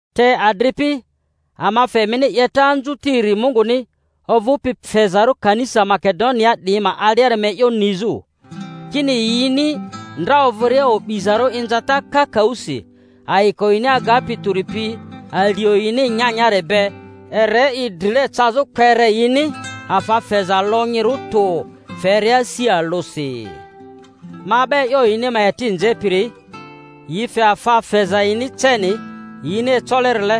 Te adripi, ama fe emini 'yeta anzutiri Munguni ovᴜpi fezarᴜ kanisa Makedoniaa 'diyi ma aliari ma e'yo nizᴜ, kini yini ndra ovᴜria o'bizarᴜ inzata kakaᴜsi, ayiko yini agapi tᴜri pi alio yini nyanyari be ere i drile cazᴜ kpere yini afa feza lonyirᴜ tᴜ feria asi alᴜsi. Ma 'ba e'yo yini ma eti nzepiri, yi fe afa feza yini ceni yini ecolerile,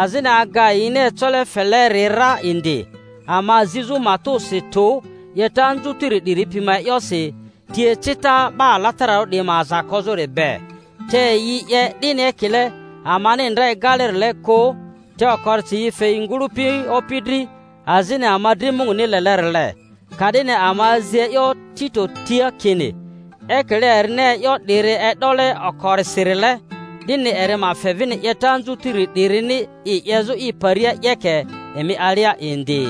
azini aga yini ecole feleri ra indi, ama zizᴜ matᴜsi tᴜ 'yeta anzutiri 'diri pi ma e'yosi, ti ecita 'ba alatararᴜ 'diyi ma aza kozᴜri be— te yi 'ye 'dini ekile amani ndra egalerile kᴜ, te okorisi yi fe yi ngᴜlᴜpi Opi dri azini ama dri Munguni lelerile. Ka'dini ama azi e'yo Tito tia kini ekile erini e'yo 'diri e'dole okorisirile, 'dini eri ma fe vini 'yeta anzutiri 'dirini i 'yezᴜ i paria 'yeke emi alia indi.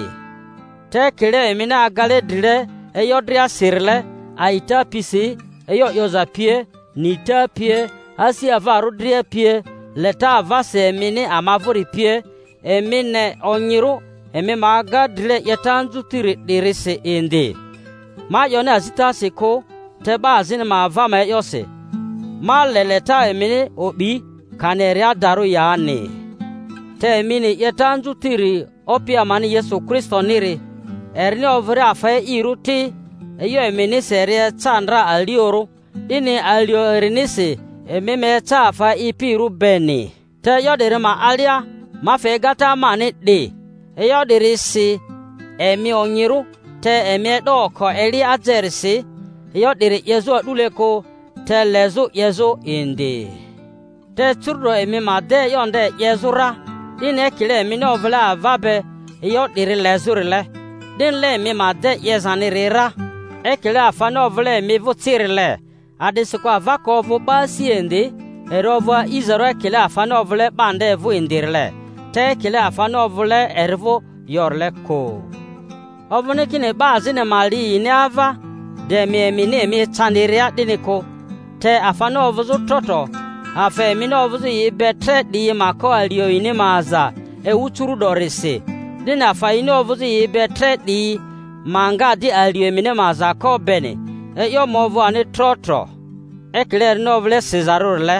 Te ekile emini agale drile e'yo driasirile—a'ita pisi, e'yo 'yoza pie, nita pie, asi avarᴜ dria pie, leta avasi emini ama vᴜri pie—emi ne onyirᴜ emi ma aga drile 'yeta anzutiri 'dirisi indi. Ma 'yoni azitasi kᴜ, te 'ba azini ma ava ma e'yosi ma le leta emini o'bi, kani eri adarᴜ yani. Te emi ni 'yeta anzutiri Opi amani Yesu Kristoniri, erini ovᴜria afa e'irᴜri ti, e'yo eminisi eri eca ndra aliorᴜ, 'dini alio erinisi emi ma eca afa e'ipirᴜ beni. Te e'yo 'diri ma alia ma fe egata mani 'di: e'yo 'diri si emi onyirᴜ, te emi e'do oko eli ajerisi e'yo 'diri 'yezᴜ a'dule kᴜ, te lezᴜ 'yezᴜ indi. Te curu'do emi ma de e'yo nde 'yezᴜ ra, 'dini ekile emini ovᴜle ava be e'yo 'diri lezᴜrile, 'dinile emi ma de 'yezaniri ra, ekile afani ovᴜle emi vᴜ cirile. A’disikᴜ ava ka ovᴜ 'ba asia indi, eri ovᴜ a'izarᴜ ekile afani ovᴜle 'ba nde vᴜ indirile, te ekile afani ovᴜle eri vᴜ yorile kᴜ. Ovᴜni kini 'ba azini ma li yini ava, de emi emini emi ecandiria, 'dini kᴜ; te afani ovᴜzᴜ tro tro, afa emini ovᴜzᴜ yi be tre 'diyi ma ko alio yini ma aza ewu curu’dorisi, 'dini afa yini ovᴜzᴜ yi be tre 'diyi ma nga di alio emini ma aza ko beni, e'yo ma ovᴜ ani tro tro. Ekile erini ovᴜle sizarᴜrile,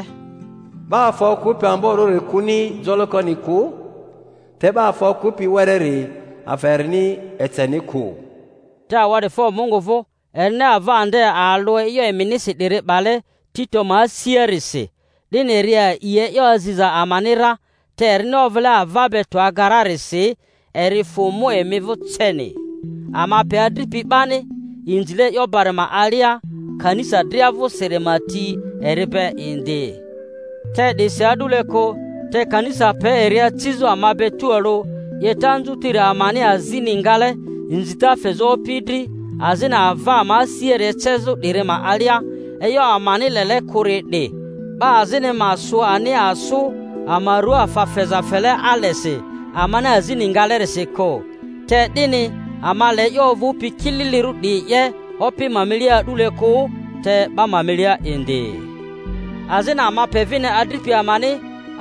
'Ba afa okᴜpi amborᴜri kᴜni jolokoni kᴜ, te 'ba afa okᴜpi wereri, afa erini eceni kᴜ. Te awa'difo Mungu vᴜ erini ava nde alᴜ e'yo eminisi 'diri 'bale Tito ma asiarisi. 'Dini eri a'i e'yo aziza amani ra, te erini ovᴜle ava be tᴜ aga rarisi, eri fᴜ mu emi vᴜ ceni. Ama pe adripi 'bani inzile e'yo bari ma alia kanisa dria vᴜsiri ma ti eri be indi; te 'disi a'dule kᴜ, te kanisa pe eri acizᴜ ama be tualᴜ 'yeta anzutiri amani azini ngale inzita fezᴜ Opi dri, azini ava ama asiari ecezᴜ 'diri ma alia. E'yo amani lele kᴜri 'di, 'ba azini ma sᴜ ani asᴜ ama ruaa afa feza fele alesi amani azini ngalerisi kᴜ, te 'dini ama le e'yo ovᴜpi kililirᴜ 'diyi 'ye Opi ma milia a'dule kᴜ, te 'ba ma milia indi. Azini ama pe vini adripi amani,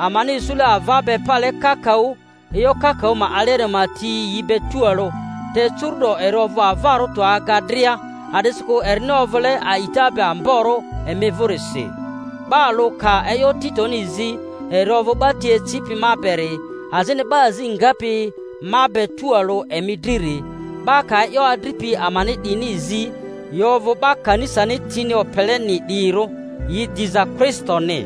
amani isule ava be pale kakaᴜ e'yo kakaᴜ ma aliari ma ti yi be tualᴜ, te curu'do eri ovᴜ avarᴜ tᴜ aga dria a'disikᴜ erini ovᴜle a'ita be amborᴜ emi vᴜrisi. 'Ba alᴜ ka e'yo Titoni zi, eri ovᴜ 'ba ti ecipi ma beri, azini 'ba azi ngapi ma be tualᴜ emi driri; 'ba ka e'yo adripi amani 'diyini zi, yi ovᴜ 'ba kanisani tini opeleni 'diyirᴜ, yi diza Kristoni.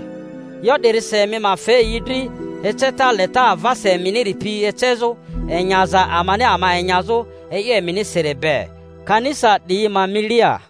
E'yo 'dirisi emi ma fe yi dri eceta leta avasi eminiri pi ecezᴜ, enyaza amani ama enyazᴜ e'yo eminisiri be, kanisa 'diyi ma milia.